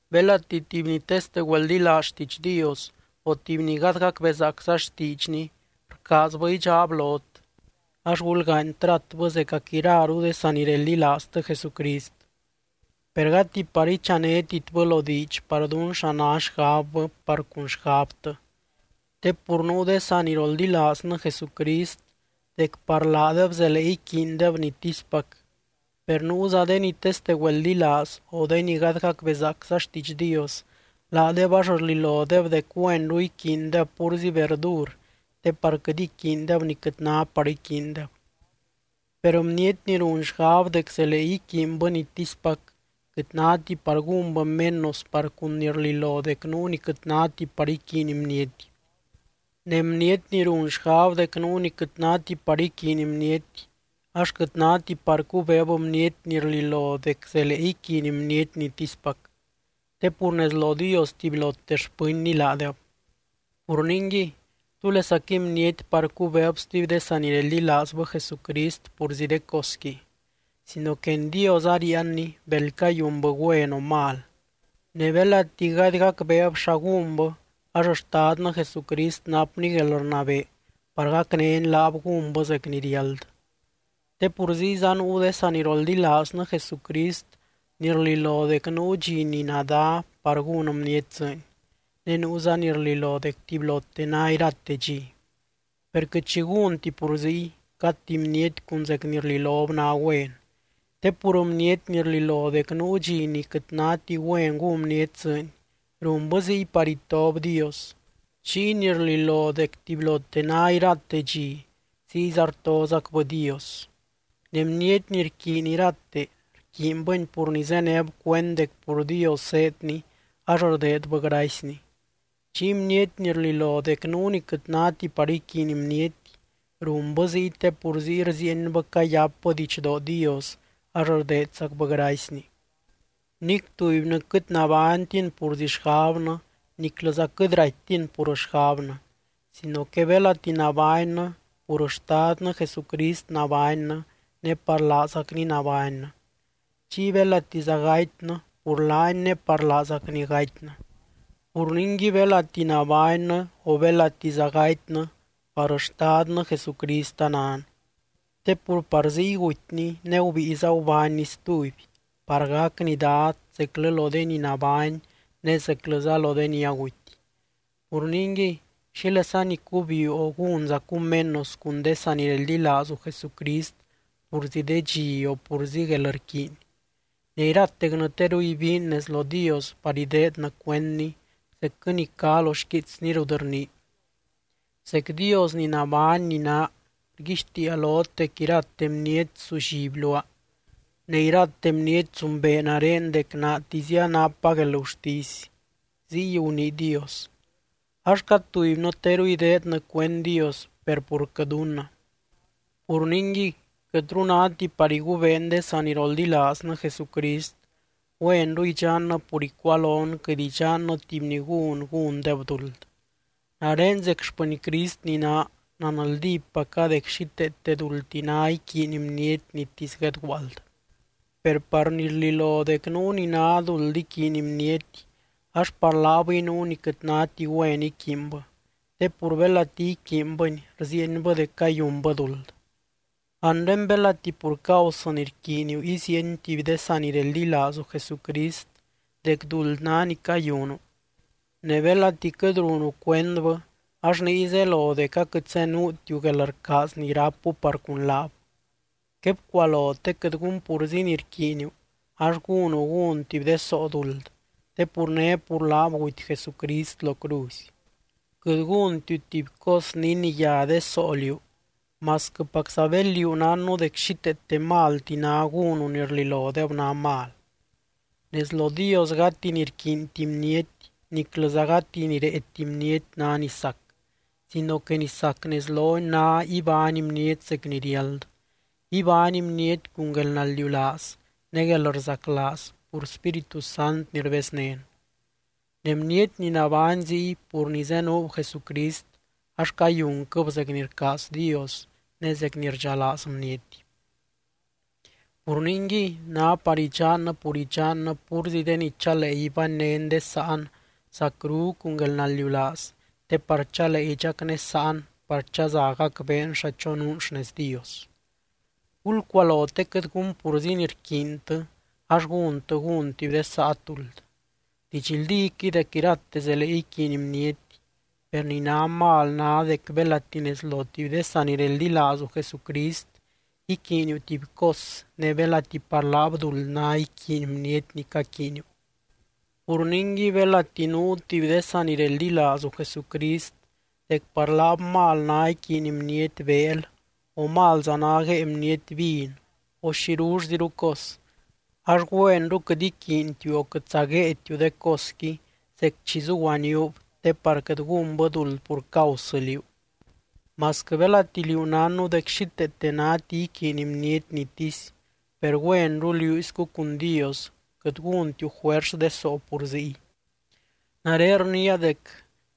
Belati tuby ni teste güeldilaaz xtiidx Dios o tuby ni gady gacbezaacza xtiidxny rcaazbɨ idxaab lot, ax gulgaany tratbɨ zecac iraru de sanireldilaaztɨ Jesucrist, per gati par ichanetitbɨ lo diidx par dún xa ná xgabbɨ par cun xgabtɨ. Te pur nuu de saniroldilaaznɨ Jesucrist dec par laadeb zelee iquiindeb nitispac, per nuuza de ni teste güeldilaaz o de ni gady gacbezaacza xtiidx Dios, laadeb ax rlilodeb dec güenru iquiindeb púrzi verdur te par quɨt iquiindeb ni quɨt ná par iquiindeb. Per bniety ni run xgab dec zelee iquiinbɨ nitispac, quɨt náti par gúnbɨ menos par cun ni rlilo dec nuu ni quɨt náti par iquiiny bniety. Ne bniety ni run xgab dec nuu ni quɨt náti par iquiiny bniety ax quɨt náti par cubeeb bniety ni rlilo dec zelee iquiiny bniety nitispac. Te pur nez lo Dios tubylote xpɨnny laadeb. Pur ningui, ¿túlesaquɨy bniety par cubeeb stuby de sanireldilaazbɨ Jesucrist purzi de cosqui? Sino que en Dios aríianni bel cayunbɨ güen o mal. Ne belati gady gacbeeb xa gúnbɨ, ax Xtadnɨ Jesucrist napny guelrnabee par gacnény laab gúnbɨ zec ni riáld. Te pur ziyza nuu de saniroldilaaznɨ Jesucrist ni rlilo dec nuu dxi ni nadá par gún bniety dzɨɨny, ne nuuza ni rlilo dec tubylote ná irate dxi. Per quɨt xi gúnti pur ziy, cad tuby bniety cun zec ni rlilob ná güen. Te pur bniety ni rlilo dec nuu dxi ni quɨt náti güen gún bniety dzɨɨny, runbɨ ziy par itob Dios, chiy ni rlilo dec tubylote ná irate dxi, ziyza rtozacbɨ Dios. Ne bniety ni rquiiny irate, rquiinbɨni pur ni zéneb cuend dec pur Dios zéedni ax rdeedbɨ gracyny. Chiy bniety ni rlilo dec nuu ni quɨt náti par iquiiny bniety, runbɨ ziy te pur ziy rziienbɨ cayápbɨ didxdoo Dios ax rdeedzacbɨ gracyny. Nic tubynɨ quɨt nabánytin purzi xgabnɨ niclɨza quɨt raittin pur xgabnɨ, sino que belati nabánnɨ pur Xtadnɨ Jesucrist nabánnɨ ne par laazacny nabánnɨ. Chiy belatiza gatynɨ pur laany ne par laazacny gatynɨ. Pur ningui belati nabánnɨ o belatiza gatynɨ par Xtadnɨ Jesucrist anan. Te pur par ziy gutyny ne gubíiza gubánny stuby, par gacny Dad zeclɨ lo de ni nabány ne zeclɨza lo de ni aguty. Pur ningui, ¿xílesani cubiuu o gúnzacu menos cun de sanireldilaazu Jesucrist purzi de dxi o purzi guelrquiiny?, ne iratecnɨ teru ibiin nez lo Dios par ideednɨ cuendny zecquɨ ni cá lo xquiitsny rut rnii: Zec Dios ni nabány ni naa, rguixtiia lot dec irate bniety sulliby luaa. Ne irate bniety zumbee nare dec naatizia rápa guelgurtisy —ziy gunii Dios. Ax cad tubynɨ teru ideednɨ cuend Dios, per purquɨ dunnɨ. Pur ningui, quɨtru náti par igubeen de saniroldilaaznɨ Jesucrist, güenru idxannɨ pur icualon quɨt idxannɨ tuby ni gún, gúndeb duld. Nare zec xpɨny Crist ni naa, nanldípaca dec xíteete duldti ná iquiiny bniety nitisy guedguaald. Per par ni rlilo dec nuu ni ná duld iquiiny bniety ax par laabɨy nuu ni quɨt náti güen iquiinbɨ, te pur belati iquiinbɨni rziienbɨ dec cayunbɨ duld. Anre belati pur causɨ ni rquiiniu iziieny tuby de sanireldilaazu Jesucrist dec duld ná ni cayunu, ne belati quɨt runu cuendbɨ ax niy zelo dec aquɨt zenuutiu guelrcaaz ni rápu par cun laab. Quebcualo te quɨt gun purzi ni rquiiniu ax gúnu gún tuby de soo duld, te pur né pur laab guty Jesucrist lo cruzy. Quɨt gúntiu tuby cos ni iniyá de soo liú, masquɨpacza bel liú nánnu dec xíteete malti ná gúnu ni rlilodeb ná mal. Nez lo Dios gati ni rquiinti bniety niclɨza gati ni réeti bniety ná ni sac, sino que ni sac nez lony ná ibány bniety zec ni riáld, ibány bniety cun guelnaldiulaaz ne guelrzaclaaz pur Spíritu Sant ni rbeznén. Ne bniety ni nabány ziy pur ni zenuub Jesucrist ax cayunquɨb zec ni rcaaz Dios ne zec ni rdxalaaz bniety. Pur ningui, ná par idxannɨ pur idxannɨ púrzi de ni chalee ibánynen de sáan zacru cun guelnaldiulaaz te par chalee idxacnésaan par chaza gacbeen xa chonuun xnez Dios. Gulcualo te quɨt gún purzi ni rquiintɨ ax gúntɨ gun tuby de saat duld. Didxldíquɨy dec irate zelee iquiiny bniety, per ni ná mal ná dec belati nez lo tuby de sanireldilaazu Jesucrist iquiiniu tuby cos ne belati par laab duld ná iquiiny bniety ni caquiiniu. Pur ningui belati nuu tuby de sanireldilaazu Jesucrist dec par laab mal ná iquiiny bniety beel o malza ná guée bniety vin o xirullziru cos, ax güenru quɨt iquiintiu o quɨtza guéetiu de cosqui zec chi zuguaníub te par quɨt gúnbɨ duld pur causɨ liú. Masquɨ belati liú nánnu dec xíteete náti iquiiny bniety nitisy, per güenru liúiscu cun Dios quɨt gúntiu juers de soo pur ziy. Nare rniia dec,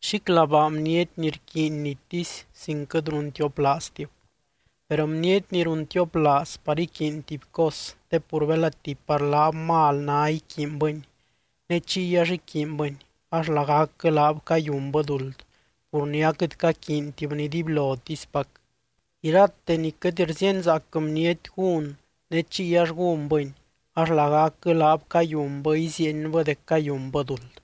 ¡xíclabaa bniety ni rquiiny nitisy sin quɨt runtioplaaztib! Per bniety ni runtioplaaz par iquiiny tuby cos te pur belati par laab mal ná iquiinbɨni ne chiy ax iquiinbɨni ax lagacquɨ laab cayunbɨ duld pur ni aquɨt caquiintibni dibylotispac. Irate ni quɨt rzíenzaac bniety gún ne chiy ax gúnbɨni ax lagacquɨ laab cayunbɨ iziienbɨ dec cayunbɨ duld.